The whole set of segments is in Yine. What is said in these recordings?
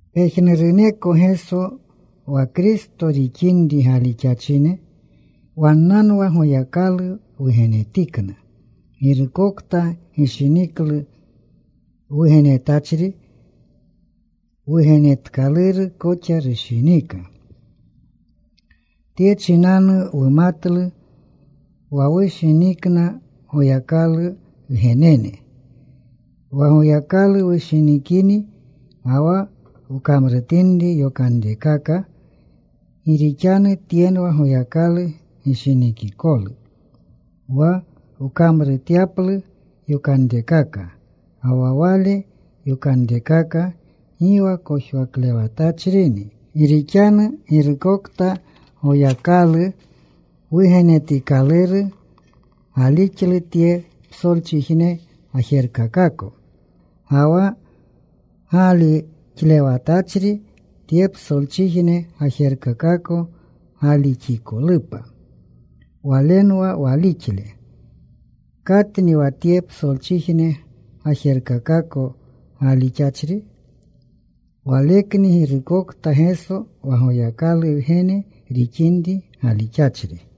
Pejnuruneko Geso wa Kristo rixinri galixachine, wannanwa Goyakalu wugenetikna. Girukokta gishiniklu wugenetachri, wugenetkaluru koxa rushinika. Tye chinanu wumatlu wa wushinikna Goyakalu wgenene, wa Goyakalu wushinikini, ga wa wkamrutinri yokanrekaka. Gi rixanu tyenwa Goyakalu gishinikikolu, wa wkamruretyaplu yokanrekaka. Ga wa Wale yokanrekaka gi wa kojwaklewatachrini. Gi rixanu girukokta Goyakalu wugenetikaluru gaalixlu tye psolchijne gajerkakako. Ga wa gaalixlewatachri, tye psolchijne gajerkakako gaalixikolupa, walenwa walixle. ¿Katni wa tye psolchijne gajerkakako gaalixachri? Walekni girukokta Geso wa Goyakalu Wgene rixinri galixachri.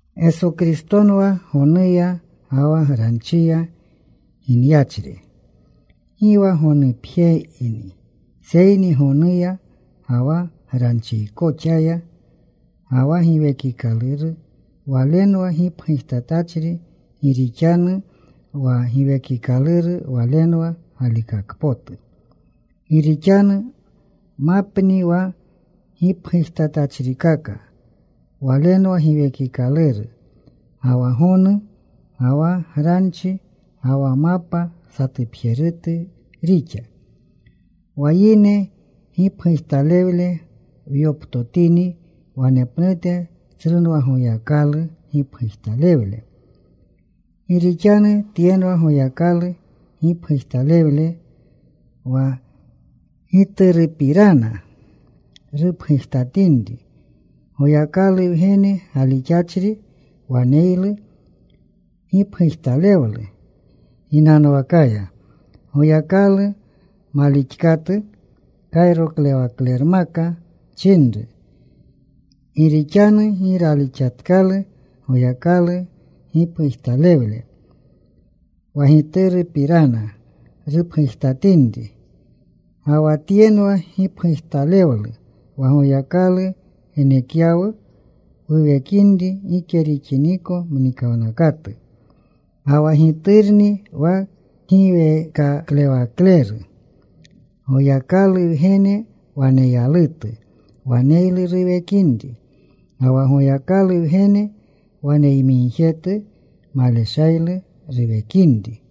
Geso Kristonwa gonuya ga wa granchiya ginyachri. Gi wa gonupjeyni, seyni gonuya ga wa granchikoxaya. Ga wa Giwekikaluru Walenwa gipgujtatachri, gi rixanu wa Giwekikaluru Walenwa galikakpotu. Gi rixanu mapni wa gipgujtatachrikaka. Walenwa Giwekikaluru, ga wa gonu, ga wa granchi. Ga wa mapa satupjerutu rixa. Wa yine gipgujtalewle wyoptotini, wanepnute tsrunwa Goyakalu gipgujtalewle. Gi rixanu tyenwa Goyakalu gipgujtalewle wa Giturupirana rupgujtatinri. Goyakalu Wgene galixachri waneylu gipgujtalewlu ginanwakaya. Goyakalu malixkatu kayroklewaklermaka chinru, gi rixanu gi ralixatkalu Goyakalu gipgujtalewle wa Giturupirana rupgujtatinri. Ga wa tyenwa gipgujtalewlu: wa Goyakalu genekyawu wuwekinri gike rixiniko mnikawnakatu, ga wa Giturni wa kgiweekaklewakleru. Goyakalu Wgene waneyalutu waneylu ruwekinri. Ga wa Goyakalu Wgene waneyamigjetu maleshaylu ruwekinri.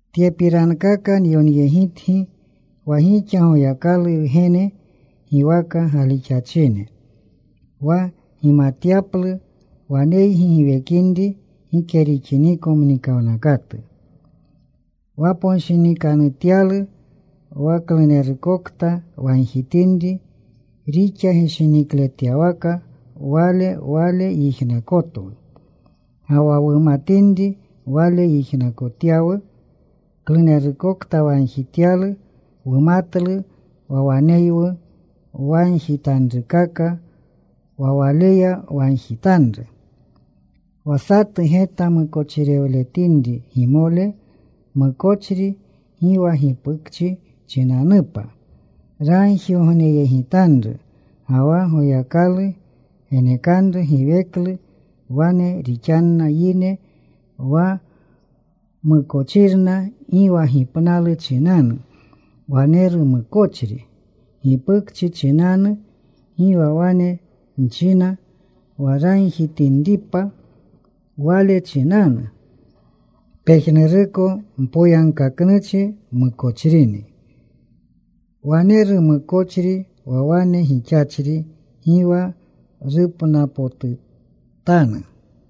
Tyepirankaka nyonyegitgi wa gixa Goyakalu Wgene giwaka galixachine, wa gimatyaplu waneygi giwekinri gike rixiniko mnikawnakatu. Waponshinikanutyalu wa klunerukokta wagjitinri rixa gishinikletyawaka Wale, Wale yijnakotwu. Ga wa wumatinri Wale yijnakotyawu klunerukokta wagjityalu, wumatlu wa waneywu wagjitanrukaka wa Waleya wagjitanru. Wa satu geta mukochirewletinri gimole, mukochri gi wa gipukchi chinanupa, ragjigogneyegitanru ga wa Goyakalu genekanru giweklu. Wane rixanna yine wa mukochirna gi wa gipnalu chinanu. Waneru mukochri gipukchi chinanu. Gi wa wane nchina wa ragjitinripa wale chinanu. Pejnuruko mpoyagkaknuchi mukochrini. Waneru mukochri wa wane gixachri gi wa rupnapotutanu.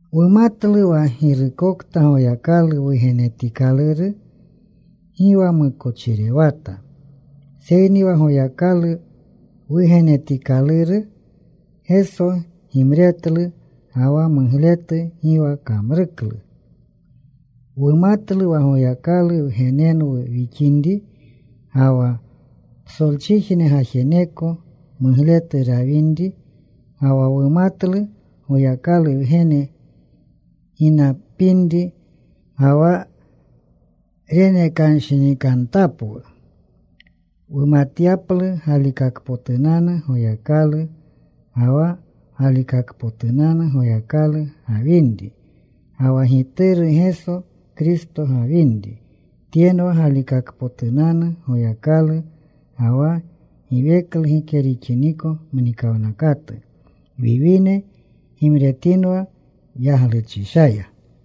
Wumatlu wa girukokta Goyakalu wugenetikaluru gi wa mukochirewata. Seyni wa Goyakalu Wugenetikaluru, Geso, gimretlu. Ga wa mugletu gi wa kamruklu. Wumatlu wa Goyakalu wgenenwu wixinri, ga wa psolchijne gajeneko mugletu rawinri. Ga wa wumatlu Goyakalu Wgene ginapinri, ga wa renekanshinikantapwu wumatyaplu galikakpotunanu Goyakalu. Ga wa galikakpotunanu Goyakalu gawinri, ga wa Gituru Geso Kristo gawinri, tyenwa galikakpotunanu Goyakalu, ga wa giweklu gike rixiniko mnikawnakatu. Wiwine, gimretinwa yagluchishaya.